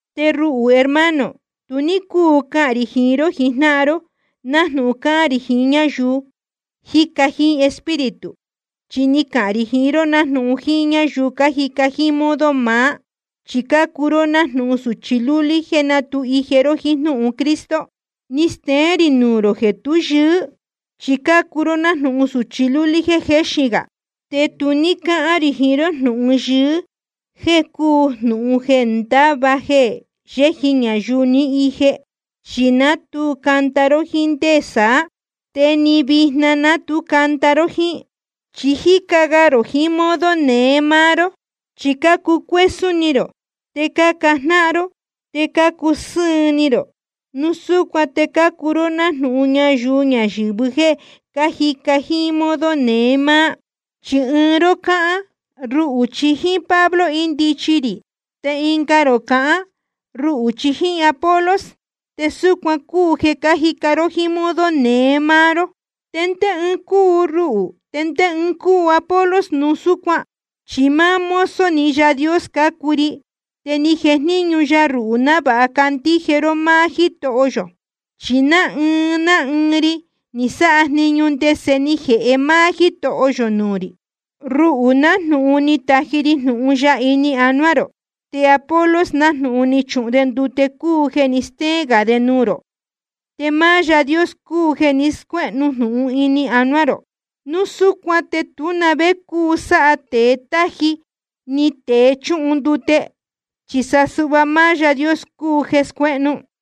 Te ruhū, hermano, tu ní cúu cahān rī jiín ró jijnáhan ró nájnūhun cáhán rī jiín ñáyuu jíca jíín Espíritu. Chi ni cahān rī jiín ró nájnūhun jíín ñáyuu cájica jíín modo maá, chi cácuu ró nájnūhun sūchi lúlí jéē ná tu ije ró jíín jnúhun Cristo. Ni steén rī nuū rō jeē tú yɨɨ́, chi cácuu ró nájnūhun sūchi lúlí jéē jéxin gā. Te tu ní cáhán rī jiín ró jnūhun yɨɨ́ jeē cúu nájnūhun jeē ndáva jeē yéji ñayuu ni ije, chi ná tu canda ró jíín ndé saá. Te ni vijna ná tu canda ró jíín. Chi cájica ga rō jiín modo neé máá ró. Chi cácucuésún ni rō, te cácajnáhan ró, te cácusɨ́ɨn ni rō. Núu súcuan te cácuu ró nájnūhun ñayuu ñayɨ̄vɨ jéē cájica jíín modo neé máá. Chi ɨɨn ró cáhán: Ruhū chi jíín Pablo índichi rī. Te ɨnga rō cahán: Ruhū chi jíín Apolos. Te súcuan cúu jeē cájica ró jíín modo neé máá ró ¿Te ndé ɨɨn cúu ruhū, te ndé ɨɨn cúu Apolos núu súcuan? Chi máá mozo‑ni Yaā Dios cácuu ri, te ni jejníñu ya ruhū návāha candíje ró máá Jítoho yō. Chi ná ɨɨn ná ɨɨn ri ni sáha jniñu ndese ni jēhe máá Jítoho yō nuū rī. Ruhū, nájnūhun ni taji ri jnūhun ya ini anuá rō, te Apolos, nájnūhun ni chuhun de ndute cúu jeē ní steén gā de nuū rō. Te máá Yaā Dios cúu jeē ni scuéhnu jnūhun ini anuá rō. Núu súcuan te tú na vé cúu sáha tēe táji ni tēe chúhun ndute, chi sa suhva máá Yaā Dios cúu jeē scuéhnu.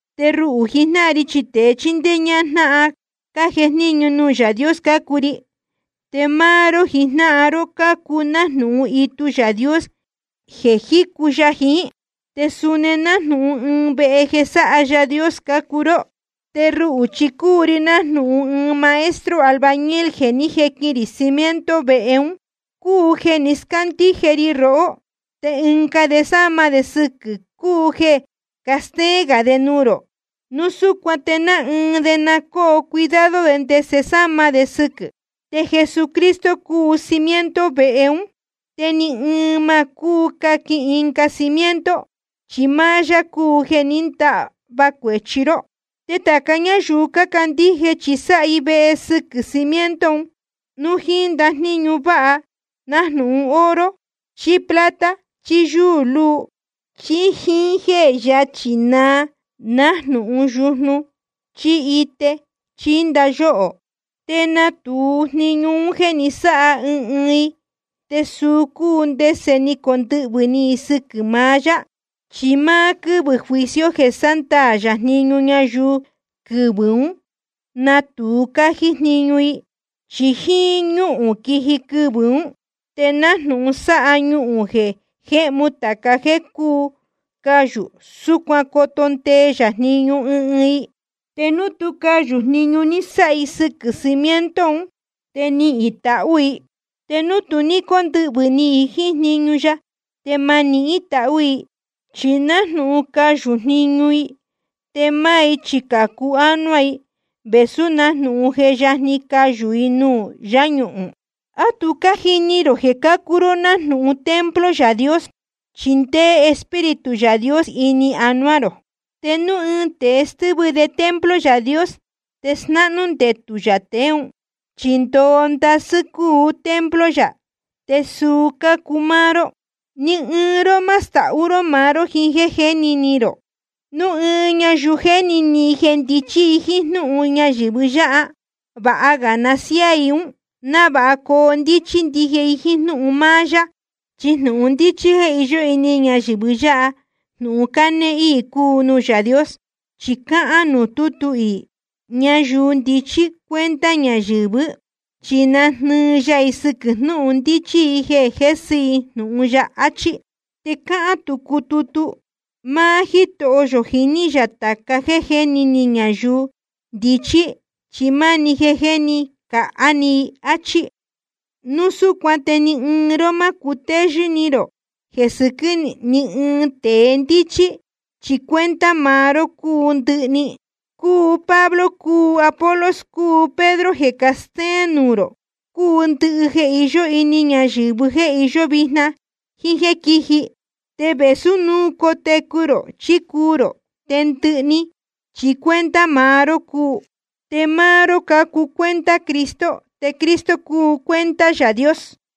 Chi ruhū jijnáhan ri chi tēe chíndéé ñájnáhan cájejníñu nuū Yaā Dios cácuu ri. Te máá ró jijnáhan ró cácuu nájnūhun itu Yaā Dios jeē jícu ya jiín. Te suni nájnūhun ɨɨn vehe jeē sáha Yaā Dios cácuu ró. Te ruhū chi cúu ri nájnūhun ɨɨn maestro albañil jeē ní jequin rī cimiento vehe ún, cúu jeē ni scándíje ri rohó. Te ɨnga de cásama de sɨquɨ̄, cúu jeē castéén gā de nuū rō. Núu súcuan te ná ɨɨn ná ɨɨn de na cóo cuidado de ndese sáma de sɨquɨ̄. Te Jesucristo cúu cimiento vehe ún, te ni ɨɨn ma cúu caquin ɨnga cimiento, chi máá yá cúu jeē ní ndahva cuēchi ró. Te tāca ñáyuu cácandíje, chi sáha i vehe sɨquɨ̄ cimiento un, núu jíín ndajníñu vāha nájnūhun oro chí plata chí yúū luu, chí jíín jéē yachí naa, nájnūhun yujnu chí ite chí ndayóhō. Te natūu jniñu un jéē ní sáha ɨɨn ɨɨn i, te suu cúu ndese ni condɨhvɨ̄ ni i sɨquɨ̄ maá yá. Chi máá quɨ́vɨ̄ juicio jeē sándaā yā jniñu ñayuu, quɨvɨ̄ ún natūu cájí jniñu i. Chi jíín ñúhūn quiji quɨvɨ̄ ún, te nájnūhun sáha ñuhūn jeē jéhmu tāca jéē cúu cayū, súcuan coto ndee ya jniñu ɨɨn ɨɨn i. Te núu tú cayū jniñu ní sáha i sɨquɨ̄ cimiento un, te nihīn i tahū i. Te núu tu ní cóndɨhvɨ̄ ni i jíín jniñu ya, te ma nihín i tahū i, chi nájnūhun cayū jniñu i. Te máá i chi cācu ánuá i, vēsú nájnūhun je yajni cayū i nuū yáñuhūn. ¿A tu cájini rō jeē cácuu ró nájnūhun templo Yaā Dios, chi ndéé Espíritu Yaā Dios ini anuá rō? Te núu ɨɨn tēe stɨ́vɨ de templo Yaā Dios, te snáhnú ndetū yā tēe ún. Chi ndoo ndasɨ́ cúu templo yā, te suu cácuu máá ró. Ni ɨɨn ró ma stahú ró maá ró jiín jéē jéni ni rō. Núu ɨɨn ñayuu jéni ni i jeē ndichí i jíín jnúhun ñayɨ̄vɨ yáha, vāha ga na siáā i ún, návāha coo ndíchí ndije i jíín jnúhun máá yá. Chi jnūhun ndíchí jéē iyó ini ñayɨ̄vɨ yáha, jnūhun cánéé íī cúu nuū Yaā Dios. Chi cáhán nuū tútu iī: Ñayuu ndichí cuenta ñayɨ̄vɨ́, chi nájnɨɨ ya i sɨquɨ̄ jnúhun ndíchí i jeē jésɨ i jnūhun ya, achí. Te cáhán tucu tutu: Máá Jítoho yō jiní yā tāca jéē jéni ni ñayuu ndichí, chi máni jeē jéni cāhá ni i, áchí. Núu súcuan te ni ɨɨn ró má cutéyɨ́ ró jeē sɨquɨ́ ni ɨɨn tēe ndíchí. Chi cuenta maá ró cúu ndɨhɨ‑ni. Cúu Pablo, cúu Apolos, cúu Pedro jeē castéén nuū rō. Cúu ndɨhɨ jeē iyó ini ñayɨ̄vɨ́, jeē iyó vijna jíín jéē quíji. Te vēsú núu cotecu rō chí cuu rō, te ndɨhɨ‑ni chi cuenta maá ró cúu. Te máá ró cácuu cuenta Cristo, te Cristo cúu cuenta Yaā Dios.